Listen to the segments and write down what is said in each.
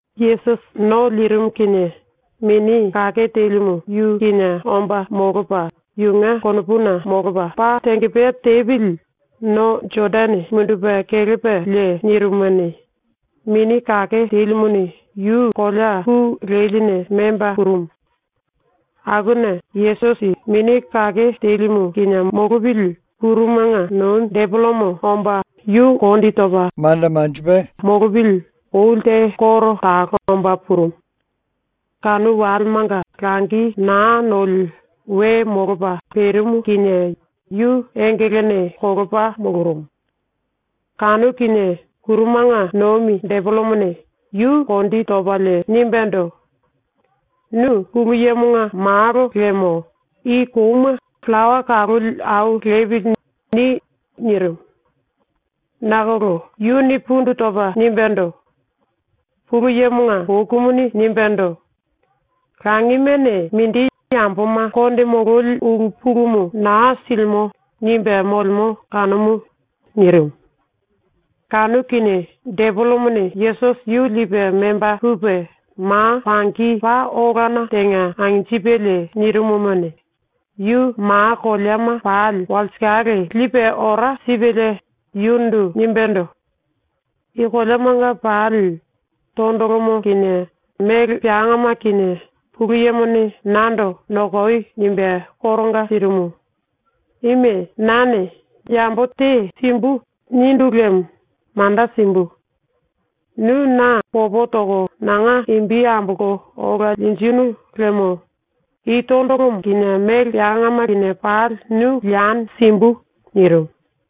Yesusi ⸤no lirimu kinie⸥ Mini Kake Telimu yu kinie omba molopa yunge konopuna molopa paa tengepea tepili no Jodane mundupe kelepalie nirimumuni, Mini Kake Telimuni yu kolea ku leline memba purumu. Akuna Yesusi ⸤Mini Kake Telimu kinie molopili⸥ ⸤kurumanga nomi⸥ depelemo omba yu kondi topa molopili oli te koro talo omba purumu. Kanu walemanga langi naa noli we molopa perimu kinie yu engelene kolopa molorumu. Kanu kinie ⸤kurumanga nomi⸥ depelemone yu ⸤kondi topalie⸥ nimbendo: “Nu Pulu Yemonga Malo liemo i kouma ‘Pillawa kaloli au lepili.’ ni.” nirimu. Nakolo yuni pundu topa nimbendo: “Pulu Yemonga bokumuni nimbendo: “Langimene mindi yamboma konde mololi ulu pulumu naa silimo.” nimbe molemo kanumu.” nirimu. Kanu kinie depelemone Yesusi yu lipe memba pupe ⸤ma pangi⸥ paa olana tenga anjipelie, yu ma koleama pali walsikale lipe ora sipelie nirimumuni, yundu nimbendo: “I koleamanga pali tondolomo kinie mele peangama kinie Pulu Yemone nando “Nokoi.” nimbe koronga sirimu. Ime nane ‘Yambo te simbu.’ nindu liemo manda simbu. Nu na popo toko nanga imbi ambolko ola linjinu liemo i tondolomo kinie mele peangama kinie pali nu lieni simbu.” nirimu.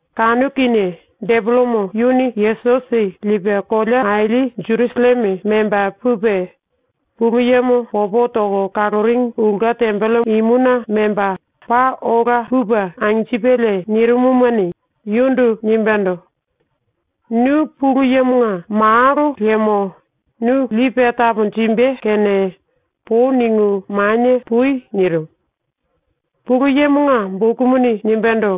Kanu kinie depelemo yuni Yesusi lipe kolea aili Jerusalleme memba pupe, ⸤Pulu Yemo popo toko kaloringi⸥ ulke tembelemonga memba, paa ola imuna memba pupe anjipelie nirimumuni, yundu nimbendo: “Nu Pulu Yemonga Malo liemo nu lipe taponjimbe kene pou ningu manie pui.” ⸤nirimu.⸥ “Pulu Yemonga bokumuni nimbendo: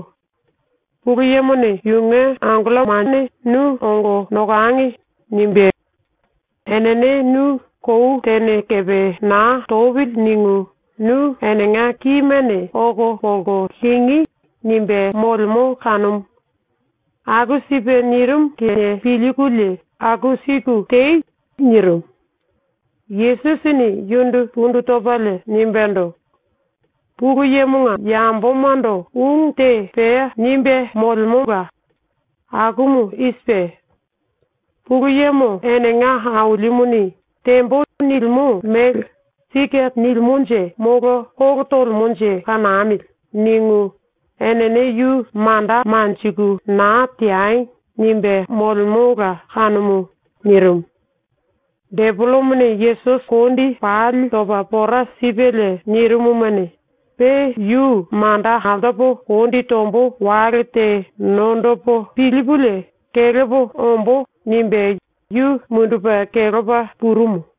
‘Pulu Yemone yunge mulu koleana angellomane ‘Nu ongo nokangi.’ nimbé. Enene nu ‘Kou tene kepe naa topili.’ ningu nu enenga kimene oko polko lingí.’ nimbe molemo kanumu. Aku sipe nirimu kene pilkulie aku siku tei.” nirimu. Yesusini yundu pundu topalie nimbendo: “Pulu Yemonga yambomando ungu te pea nimbe molemola. Akumu i sipe: ‘Pulu Yemo enenga Ailimuni “Tembo.” nilimo mele ‘Sike nilimonje molo kolo tolemonje kanamili.’ ningu enene yu manda manjiku naa teangi.’ nimbe molemola kanumu.” nirimu. Depelemone Yesusi kondi pali topa pora sipelie nirimumuni, ‘Pe yu manda altopo kondi tombo wale te nondopo pilipulie kelepo ombo.’ nimbe yu mundupe kelepa purumu.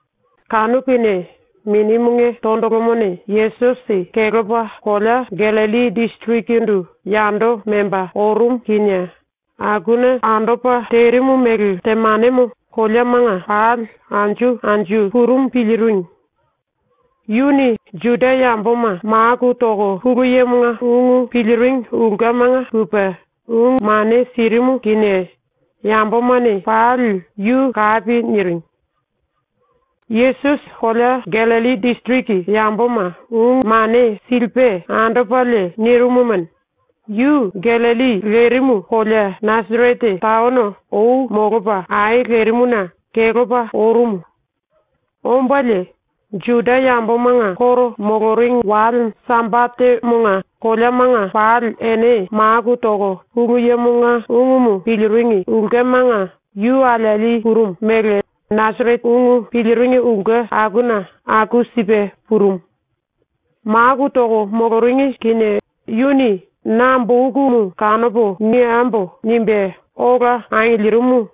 Kanu kinie Minimunge tondolomone Yesusi kelepa kolea Gallilli disirikindu yando memba orumu kinie akuna andopa terimu mele temanemo koleamanga pali anju anju purumu piliringi. Yuni Juda yamboma maku toko Pulu Yemonga ungumu piliringi ulkemanga pupe ungu mane sirimu kinie yambomane pali yu kapi niringi. Yesusi kolea Gallilli disiriki yamboma ungu mane silipe andopalie nirimumuni, yu Gallilli lerimu kolea Nasarete taono ou molopa ai lerimuna kelepa orumu. Ombalie ⸤Juda yambomanga koro moloringi⸥ wale Sambatemonga koleamanga pali ene maku toko Pulu Yemonga ungumu piliringi ulkemanga yu alieli purumu mele Nasarete ungu piliringi ulke akuna aku sipe purumu. ⸤Maku toko moloringi kinie⸥ yuni “Na bokumu kanopo niembo.” nimbe ola angilirimu.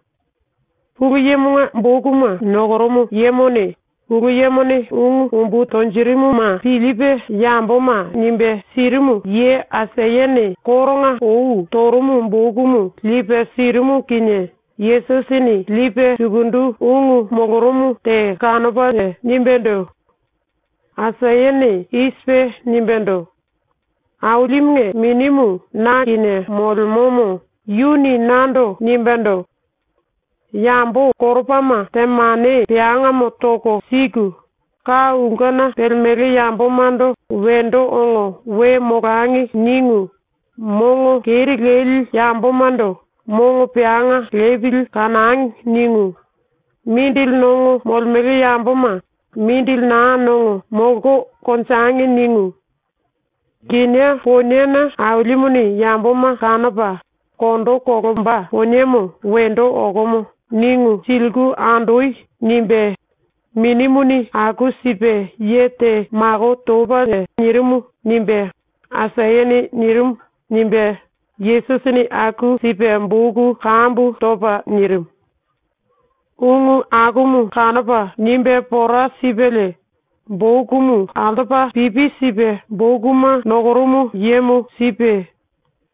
⸤Pulu Yemonga bokuma nokorumu yemone⸥ Pulu Yemone ungu umbu tonjirimuma pilipe yamboma nimbe sirimu ye Aisayane koronga ou torumu bokumu lipe sirimu kinie, Yesusini lipe sukundu ungu molorumu te kanopalie nimbendo: “⸤Aisayane i sipe nimbendo:⸥ “Ailimunge Minimu na kinie molemomo yuni nando nimbendo: “Yambo koropama temane peangamo toko siku, ka ulkena pelemele yambomando ‘Wendo ongo we molangi.’ ningu mongo keri leli yambomando ‘Mongo peanga lepili kanangi.’ ningu, mindili nongo molemele yamboma ‘Mindili naa nongo, molko konjengi’ ningu, ‘Kinié poniena Ailimuni yamboma kanopa kondo kolomba poniemo wendo okomo.’ ningu siliku andoi.” nimbe Minimuni aku sipe ye te mako topalie nirimu.” nimbe Aisayane nirimu.” nimbe Yesusini aku sipe boku kambu topa nirimu. Ungu akumu kanopa nimbe pora sipelie bokumu altopa pipi sipe bokuma nokorumu yemo sipe,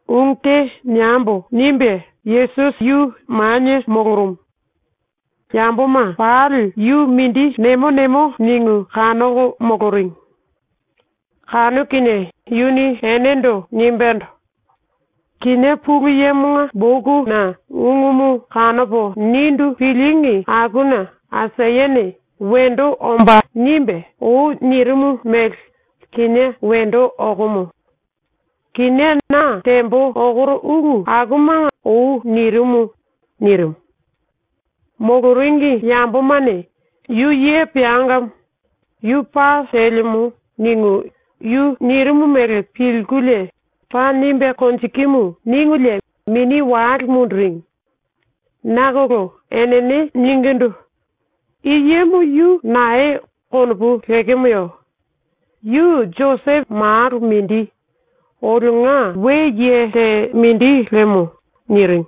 ⸤“Ungu te niembo.” nimbe⸥ Yesusi yu manie molorumu. Yamboma pali yu mindi nemo nemo ningu kanoko moloringi. Kanu kinie yuni enendo nimbendo: “Kinié Pulu Yemonga bokuna ungumu kanopo nindu pilíngi akuna Aisayane “Wendo ombá.” nimbe, ou nirimu mele kinié wendo okomo. ⸤Kinié na tembo okoro ulu akumanga ou nirimu.⸥” nirimu. Moloringi yambomane “Yu ye peangamo. Yu paa telemo.” ningu yu nirimu mele pilkulie “Paa nimbe konjikimu.” ningulie mini wale munduringi. ⸤Nakolo⸥ enene ningindu: “I yemo ⸤yu nae konopu lekemoye?⸥ Yu Josepo malo mindi, ⸤olionga we ye te mindi lemo⸥.” niringi.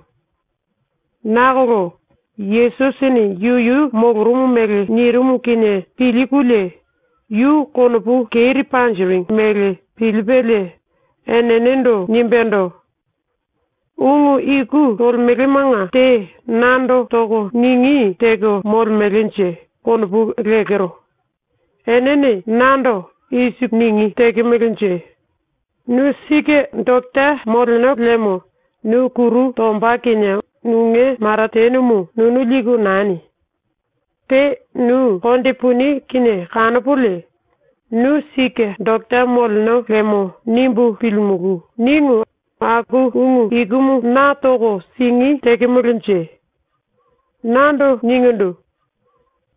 ⸤Nakolo⸥ Yesusini ⸤yuyu molorumu mele nirimu kinie pilkulie yu konopu keri panjiringi mele pilipelie⸥ enendo nimbendo: “Ungu iku tolemelemanga te nando toko ningí teko molemelenje konopu lekero. Enene nando i siku ningí tekemelenje: “Nu sike doketa moleno liemo nu kuru tomba kinie nunge maratenemo nunu liku nani. Pe nu konde puni ⸤kinie kanopolie ‘Nu sike doketa moleno lemo.’ nimbu pilimulú.” ningu aku ungu ikumu na toko singí tekemelenje?⸥ Nando ningindu: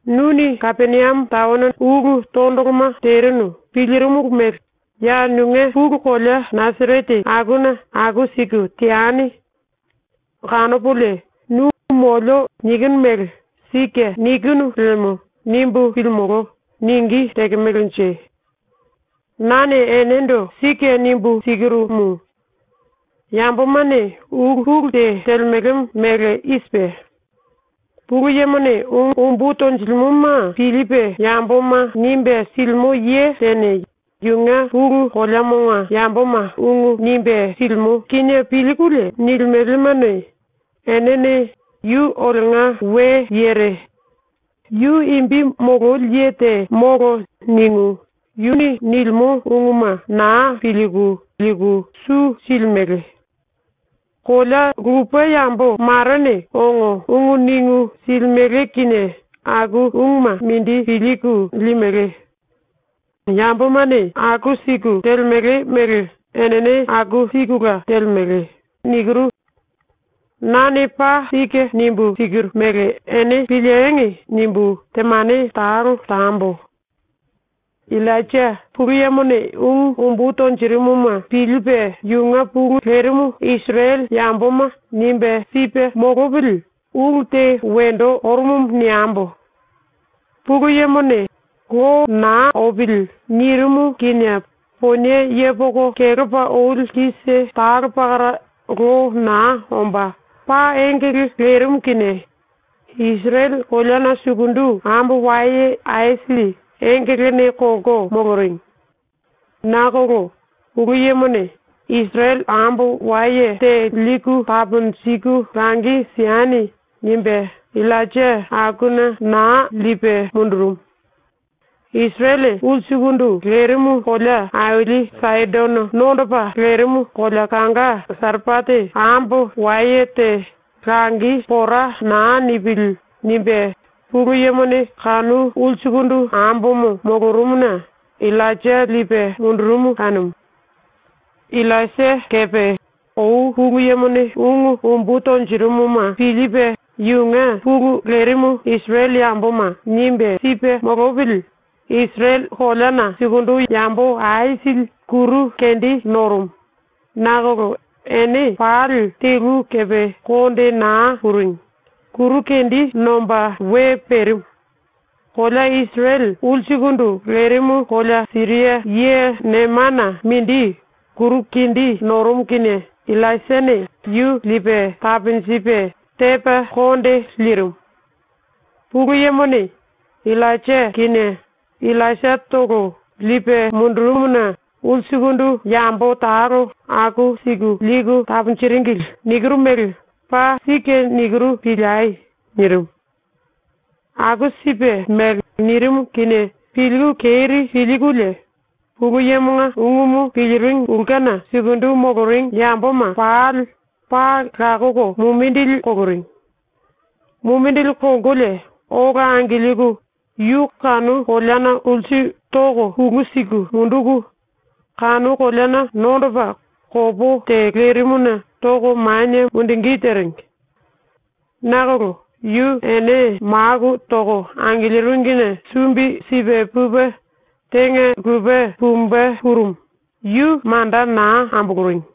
“Nuni Kapeniame taono ulu tondoloma terinu pilirimulu mele ya nunge pulu kolea ⸤Nasarete⸥ akuna aku siku teani. ⸤Kanopolie nu “molio.” nikinu mele ‘Sike nikinu lemo.’ nimbu pilimolo.⸥” ningí tekemelenje? “Nane enendo sike nimbu sikirumu: Yambomane ulu pulu te telemele mele i sipe: Pulu Yemone ungu umbu tonjilimoma pilipe yamboma nimbe silimo ye tene yunge pulu koleamonga yamboma ungu nimbe silimo kinie pilkulie nilimelemone, enene ‘Yu olionga we yere. Yu imbi mololi ye te molo.’ ningu yu nilimo unguma naa pilku liku su silimele. ⸤Kolea lupe yambo marene ongo ungu ningu silimele kinie aku unguma mindi pilku limele. Yambomane aku siku telemele mele enene aku sikula telemele.⸥ ‘Nane paa sike nimbu sikiru mele ene piliengi!’ nimbu ⸤temane talo tambo.⸥ “Illainja Pulu Yemone ungu umbu tonjirimuma pilipe ⸤yunge pulu lerimu⸥ Isirele yamboma nimbe sipe molopili ulu te wendo orumumu niembo. Pulu Yemone “Lo naa opili.” nirimu kinie ponie yepoko kelepa oli kise talo pakara lo naa omba paa engele lerimu kinie Isirele koleana sukundu ambo waye aisili ⸤engelene kolko⸥ moloringi. Nakolo Pulu Yemone “Isirele ambo waye te liku taponjiku langi sieni.” nimbe Illainja akuna naa lipe mundurumu. ⸤Isirele ulsukundu lerimu⸥ kolea aili Saidono nondopa lerimu kolea kanga Sarepate ambo waye te ⸤‘Langi pora naa nipili.’ nimbe Pulu Yemone kanu ulsukundu ambomo⸥ molorumuna Illainja lipe mundurumu kanumu. “Illaisia kepe ou Pulu Yemone ungu umbu tonjirimuma pilipe ⸤yunge pulu lerimu Isirele yamboma⸥ nimbe sipe molopili Isirele koleana sukundu yambo aisili kuru kendi norumu, nakolo ene pali telu kepe konde naa puringi, kuru kendi nomba we perimu. ⸤Kolea Isirele ulsukundu lerimu⸥ kolea Siria ye Nemana mindi kuru kendi norumu kinie Illaisiane yu ⸤lipe taponjipe⸥ tepa konde lirimu. ⸤Pulu Yemone Illainja kinie Illaisiatolo lipe mundurumuna ulsukundu yambo talo aku siku liku taponjiringili nikiru mele paa sike nikiru piliei.⸥” nirimu. Aku sipe mele nirimu kinie pilku keri pilkulie Pulu Yemonga ungumu piliringi ulkena sukundu moloringi yamboma pali paa lakoko mumindili koloringi. Mumindili kolkolie ola angilku yu kanu koleana ulsu toko pulu siku munduku, kanu koleana nondopa kopó te lerimuna toko manie mundungí teringi. Nakolo yu ene maku toko angiliringine sumbi sipe pupe tenga lupe pumbe purumu, yu manda naa amboloringi.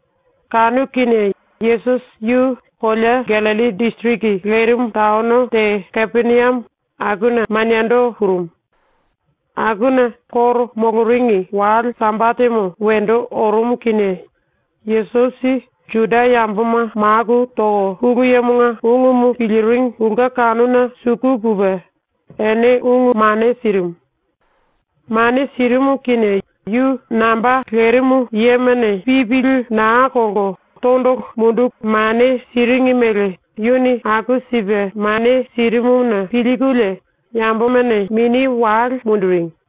Kanu kinie Yesusi yu kolea Gallilli disiriki lerimu taono te Kapeniame akuna maniendo purumu. Akuna ⸤Juda yambomanga koro moloringi⸥ wale Sambatemo wendo orumu kinie Yesusi ⸤Juda yamboma maku toko Pulu Yemonga ungumu piliringi ulke kanuna suku pupe⸥ ene ungu mane sirimu. Mane sirimu kinie yu namba lerimu yemane pipili naa kolko tondolo munduku mane siringi mele yuni aku sipe mane sirimuna pilkulie yambomane mini wale munduringi.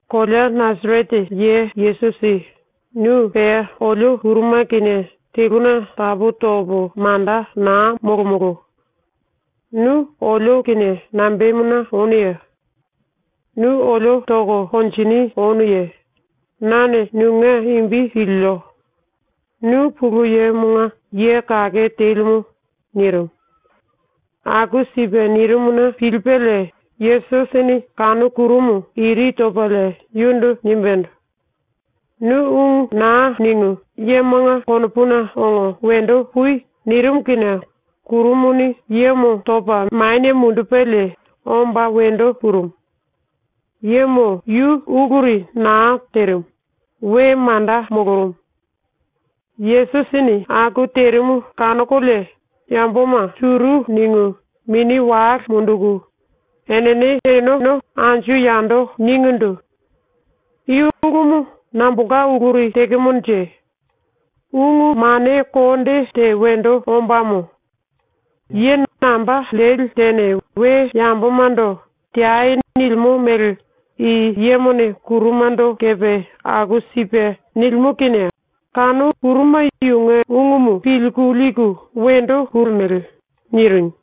“Kolea Nasarete ye Yesusi, nu pea olio ⸤kuruma⸥ kinie teluna tapu topo manda naa molomolo. Nu olio kinie nambemuna onuye? Nu olio toko konjini onuye? Nane nunge imbi pilio. Nu Pulu Yemonga Ye Kake Telimu.” nirimu. ⸤Aku sipe nirimuna pilipelie⸥ Yesusini kanu kurumu iri topalie yundu nimbendo: “Nu ungu naa ningu yemonga konopuna ongo wendo pui!” nirimu kinie kurumuni yemo topa manie mundupelie omba wendo purumu. Yemo yu uluri naa terimu, we manda molorumu. ⸤Yesusini aku terimu kanokolie⸥ yamboma suru ningu, mini wale munduku, enene eneno anju yando ningindu: “I ulumu nambolka uluri tekemonje? Ungu mane konde te wendo ombámo. Ye namba leli tene we yambomando “Teai.” nilimo mele i yemone kurumando kepe aku sipe nilimo kinie kanu kuruma yunge ungumu pilku liku wendo olemele.” niringi.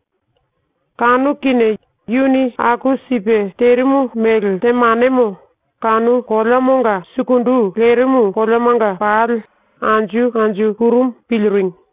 Kanu kinie yuni aku sipe terimu mele temanemo kanu koleamonga sukundu lerimu koleamanga pali anju anju purumu piliringi.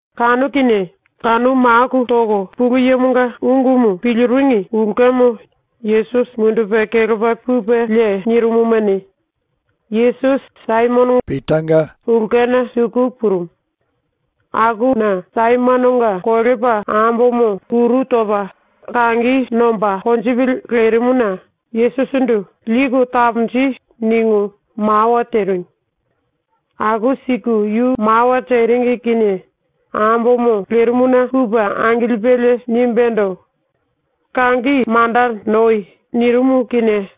Kanu kinie kanu maku toko Pulu Yemonga ungumu piliringi ulkemo Yesusi mundupe kelepa pupelie nirimumuni, Yesusi Saimononga ulkena suku purumu. Akuna Saimononga kolepa ambomo kuru topa kangi nomba konjipili lerimuna Yesusindu “Liku taponji.” ningu mawa teringi. Aku siku yu mawa teringi kinie ambomo lerimuna pupe angilipelie nimbendo: “Kangi manda noi.” nirimu kinie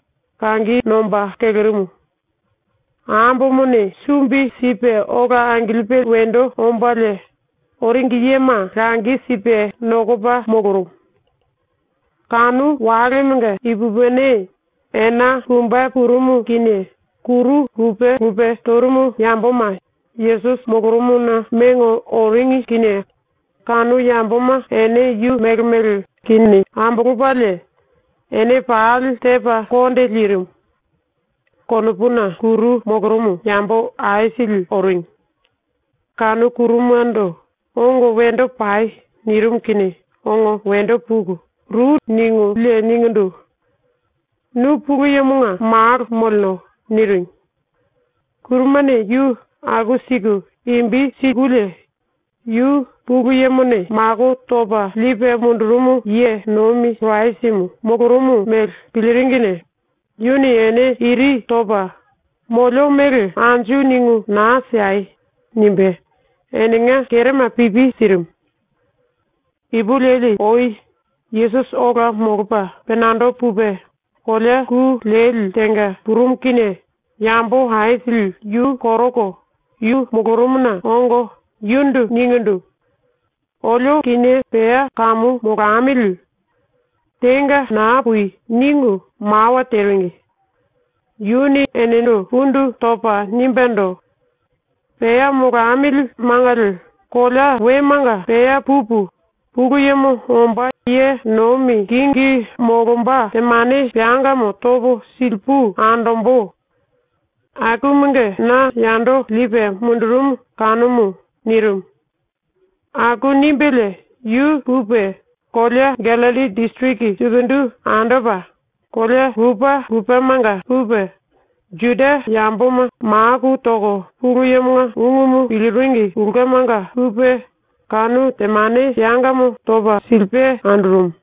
kangi nomba kelerimu. Ambomone sumbi sipe ola angilipe wendo ombalie, oringi yema langi sipe nokopa molorumu. Kanu walemonga ipupini, ena pumbe purumu kinie, kuru lupe lupe torumu yamboma Yesusi molorumuna mengo oringi kinie kanu yamboma ene yu mele mele kini ambolopalie ene pali tepa konde lirimu. ⸤Konopuna kuru molorumu⸥ yambo aisili ⸤oringi.⸥ Kanu kuruma⸤ndo “Ongo wendo pai.” nirimu kinie⸥ ongo wendo puku ru ningulie ningindu: “Nu Pulu Yemonga Malo moleno.” niringi. Kurumane yu aku siku imbi sikulie yu ⸤Pulu Yemone mako topa lipe mundurumu ye nomi⸥ Kirasimu molorumu mele piliringine yuni ene iri topa “Molio mele anju ningu naa siei.” nimbe enenga kerema pipi sirimu. Ipulueli ou Yesusi ola molopa penando pupe kolea ku leli tenga purumu kinie yambo aisili yu koroko yu molorumuna ongo yundu ningindu: “Olio kinie pea kamu molamili. Tenga naa pui.” ningu mawa teringi. Yuni enendo pundu topa nimbendo: “⸤Pea molamili mangali⸥ kolea wemanga pea pupu, Pulu Yemo omba ye nomi kingi molomba temane peangamo topo silipu andombo. Akumunge na yando lipe mundurumu kanumu.” nirimu. Aku nimbelie yu pupe kolea Gallilli ⸤disiriki⸥ sukundu andopa, kolea lupe lupemanga pupe Juda yamboma maku toko Pulu Yemonga ungumu piliringi ulkemanga pupe kanu temane peangamo topa silipe andorumu.